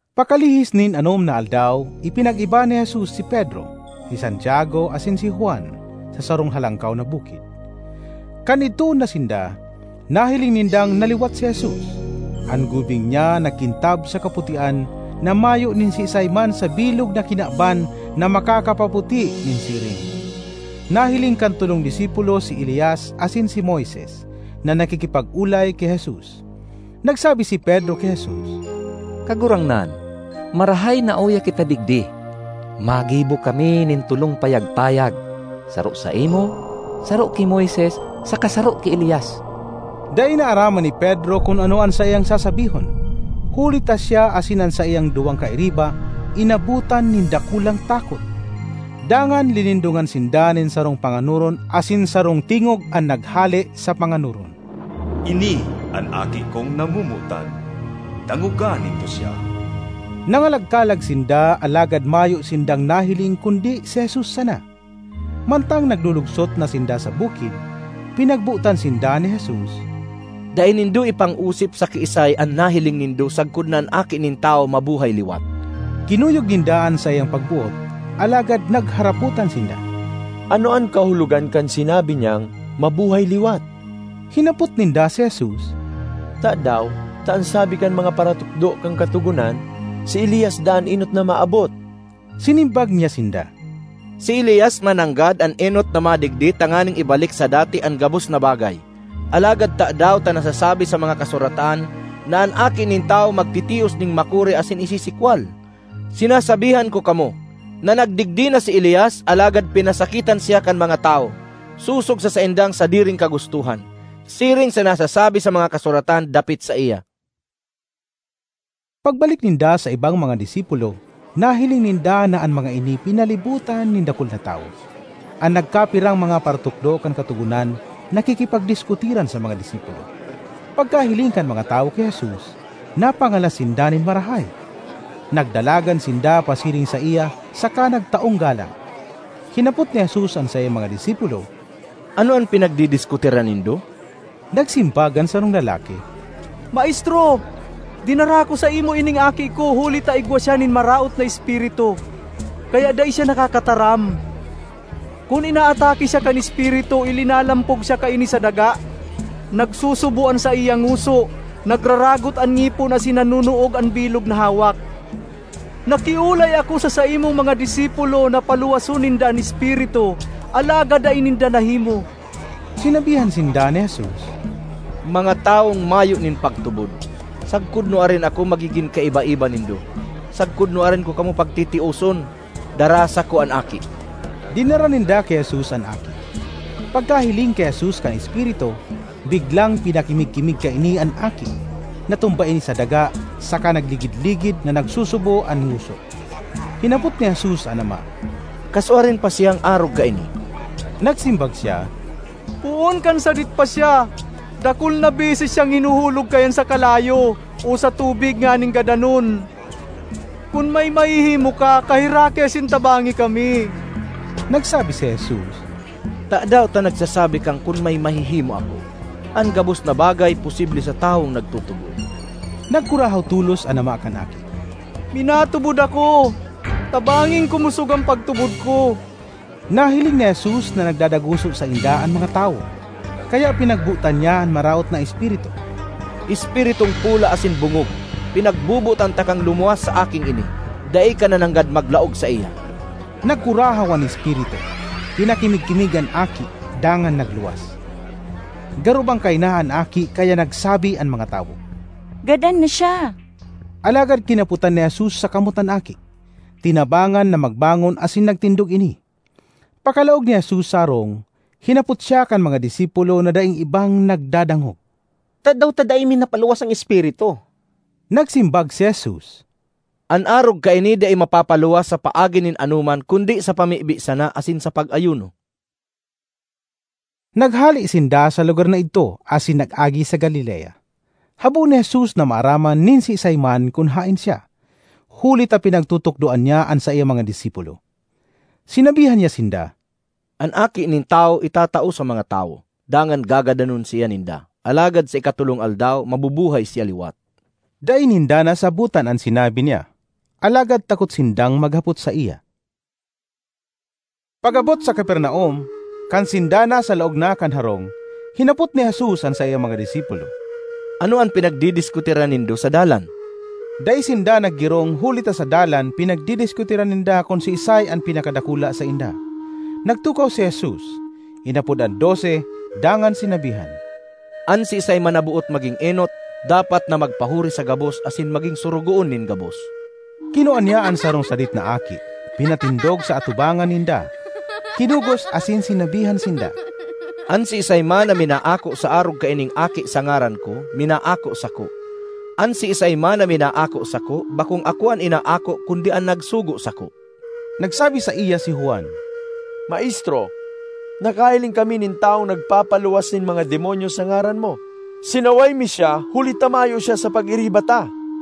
Pakalihis nin anom na aldaw ipinag-iba ni Jesus si Pedro, si Santiago asin si Juan, sa sarong halangkaw na bukid. Kan idtoon na sinda, nahiling nindang naliwat si Jesus. An gubing niya nagkintab sa kaputian na mayo nin siisay man sa bilog na kinaban na makakapaputi nin siring. Nahiling kan tolong disipulo si Elias asin si Moises na nakikipag-olay ki Jesus. Nagsabi si Pedro ki Jesus, “Kagurangnan, marahay na uya kita digdi. Magibo kami nin tolong payag-payag; saro saimo, saro ki Moises saka saro ki Elias.” Dai naaraman ni Pedro kun ano an saiyang sasabihon, huli ta siya asin an saiyang duwang kairiba inabotan nin dakulang takot. Dangan linindongan sinda nin sarong panganoron asin sarong tingog an naghale sa panganoron, “Ini an Aki kong namomotan; dangoga nindo siya? (!)” Nangalag-kalag sinda alagad mayo sindang nahiling kundi si Jesus sana. Mantang naglulugsot na sinda sa bukid, pinagbotan sinda ni Jesus, “Dai nindo ipang-osip sa kiisay an nahiling nindo sagkod na an Aki nin Tawo mabuhay liwat.” Kinuyog ninda an saiyang pagboot, alagad nagharapotan sinda, “Ano an kahulogan kan sinabi niyang ‘mabuhay liwat’?” Hinapot ninda si Jesus, “Tadaw ta an sabi kan mga paratukdo kan Katogonan, si Elias daa an enot na maabot?” Sinimbag niya sinda, “Si Elias mananggad an enot na madigdi tanganing ibalik sa dati an gabos na bagay. Alagad tadaw ta nasasabi sa mga Kasuratan na an Aki nin Tawo magtitios nin makuri asin isisikwal? Sinasabihan ko kamo, na nagdigdi na si Elias alagad pinasakitan siya kan mga tawo, sosog sa saindang sadiring kagustohan, siring sa nasasabi sa mga Kasuratan dapit saiya.” Pagbalik ninda sa ibang mga disipulo, nahiling ninda na an mga ini pinalibotan nin dakul na tawo. An nagkapirang mga paratukdo kan Katogonan nakikipagdiskutiran sa mga disipulo. Pagkahiling kan mga tawo ki Jesus, napangalas sinda nin marahay; nagdalagan sinda pasiring saiya saka nagtaong galang. Hinapot ni Jesus an saiyang mga disipulo, “Ano an pinagdidiskutiran nindo?” Nagsimbag an sarong lalaki, “Maestro, dinara ko saimo ining aki ko huli ta igwa siya nin maraot na espiritu, kaya dai siya nakakataram. Kun inaatake siya kan espiritu, ilinalampog siya kaini sa daga, nagsusubo an saiyang ngoso, nagraragot an ngipon asin nanonoog an bilog na hawak. Nakiolay ako sa saimong mga disipulo na paluwason ninda an espiritu, alagad dai ninda nahimo.” Sinabihan sinda ni Jesus, “Mga tawong mayo nin pagtubod! Sagkod nuarin ako magigin kaiba-iba nindo? Sagkod nuarin ko kamo pagtitioson? Daraha sako an aki!” Dinara ninda ki Jesus an aki. Pagkahiling ki Jesus kan espiritu, biglang pinakimig-kimig kaini an aki; natumba ini sa daga saka nagligid-ligid na nagsusubo an ngoso. Hinapot ni Jesus an ama, “Kasuarin pa siyang arog kaini?” Nagsimbag siya, “Poon kan sadit pa siya. Dakul na beses siyang hinuhulog kaiyan sa kalayo o sa tubig nganing gadanon. Kun may mahihimo ka, kaheraki asin tabangi kami!” Nagsabi si Jesus, “Tadaw ta nagsasabi kang kun may mahihimo ako? An gabos na bagay posible sa tawong nagtutubod.” Nagkurahaw tolos an ama kan aki, “Minatubod ako! Tabanging kumosog an pagtubod ko!” Nahiling ni Jesus na nagdadaguso sainda an mga tawo, kaya pinagbotan niya an maraot na espiritu, “Espiritung pola asin bongog, pinagbobotan takang lumuwas sa aking ini; dai ka na nanggad maglaog saiya!” Nagkurahaw an espiritu, pinakimig-kimig an aki, dangan nagluwas. Garo bangkay na an aki kaya nagsabi an mga tawo, “Gadan na siya!” Alagad kinapotan ni Jesus sa kamot an aki, tinabangan na magbangon asin nagtindog ini. Pakalaog ni Jesus sa harong, hinapot siya kan mga disipulo na daing ibang nagdadangog, “Tadaw ta dai mi napaluwas an espiritu?” Nagsimbag si Jesus, “An arog kaini dai mapapaluwas sa paagi nin anoman kundi sa pamibi sana asin sa pag-ayuno.” Naghale sinda sa lugar na idto asin nag-agi sa Galilea. Habo ni Jesus na maaraman nin siisay man kun haen siya, huli ta pinagtutukdoan niya an saiyang mga disipulo. Sinabihan niya sinda, “An Aki nin Tawo itatao sa mga tawo, dangan gagadanon siya ninda; alagad sa ikatolong aldaw mabubuhay siya liwat.” Dai ninda nasabotan an sinabi niya, alagad takot sindang maghapot saiya. Pag-abot sa Capernaum, kan sinda nasa laog na kan harong, hinapot ni Jesus an saiyang mga disipulo, “Ano an pinagdidiskutiran nindo sa dalan?” Dai sinda naggirong huli ta sa dalan pinagdidiskutiran ninda kun siisay an pinakadakula sainda. Nagtukaw si Jesus, inapod an dose dangan sinabihan, “An siisay man na boot magin enot, dapat na magpahuri sa gabos asin maging sorogoon nin gabos.” Kinua niya an sarong sadit na aki, pinatindog sa atubangan ninda, kinugos asin sinabihan sinda, ”An siisay man na minaako sa arog kaining aki sa ngaran ko, minaako sako; an siisay man na minaako sako, bakong ako an inaako kundi an nagsugo sako.” Nagsabi saiya si Juan, “Maestro, nakahiling kami nin tawong nagpapaluwas nin mga demonyo sa ngaran mo. Sinaway mi siya huli ta mayo siya sa pag-iriba ta.”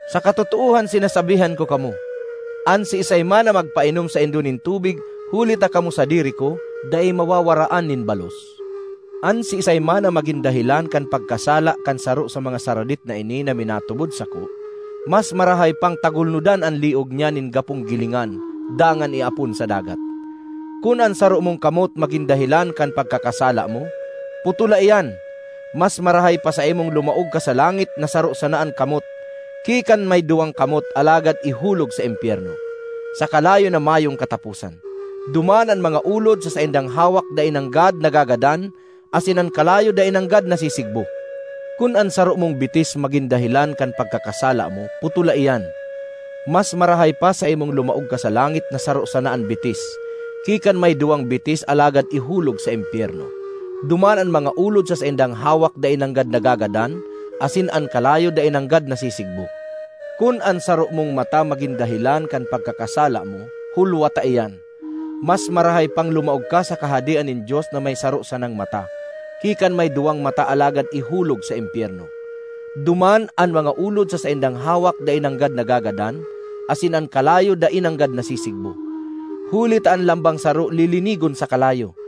Sa katotoohan sinasabihan ko kamo, an siisay man na magpainom saindo nin tubig huli ta kamo sadiri ko, dai mawawaraan nin balos.” ”An siisay man na magin dahelan kan pagkasala kan saro sa mga saradit na ini na minatubod sako, mas marahay pang tagulnodan an liog niya nin gapong gilingan dangan iapon sa dagat. Kun an saro mong kamot magin dahelan kan pagkakasala mo, putola iyan! Mas marahay pa saimong lumaog ka sa langit na saro sana an kamot ki kan may duwang kamot alagad ihulog sa impyerno, sa kalayo na mayong kataposan. Duman ‘an mga ulod sa saindang hawak dai nanggad nagagadan asin an kalayo dai nanggad nasisigbo.’ 'Kun an saro mong bitis magin dahelan kan pagkakasala mo, putola iyan! Mas marahay pa saimong lumaog ka sa langit na saro sana an bitis, ki kan may duwang bitis alagad ihulog sa impyerno. Duman ‘an mga ulod sa saindang hawak dai nanggad nagagadan asin an kalayo dai nanggad nasisigbo.’ Kun an saro mong mata magin dahelan kan pagkakasala mo, hulwata iyan! Mas marahay pang lumaog ka sa Kahadean nin Dios na may saro sanang mata, ki kan may duwang mata alagad ihulog sa impyerno. Duman ‘an mga ulod sa saindang hawak dai nanggad nagagadan asin an kalayo dai nanggad nasisigbo.’ ”Huli ta an lambang saro lilinigon sa kalayo.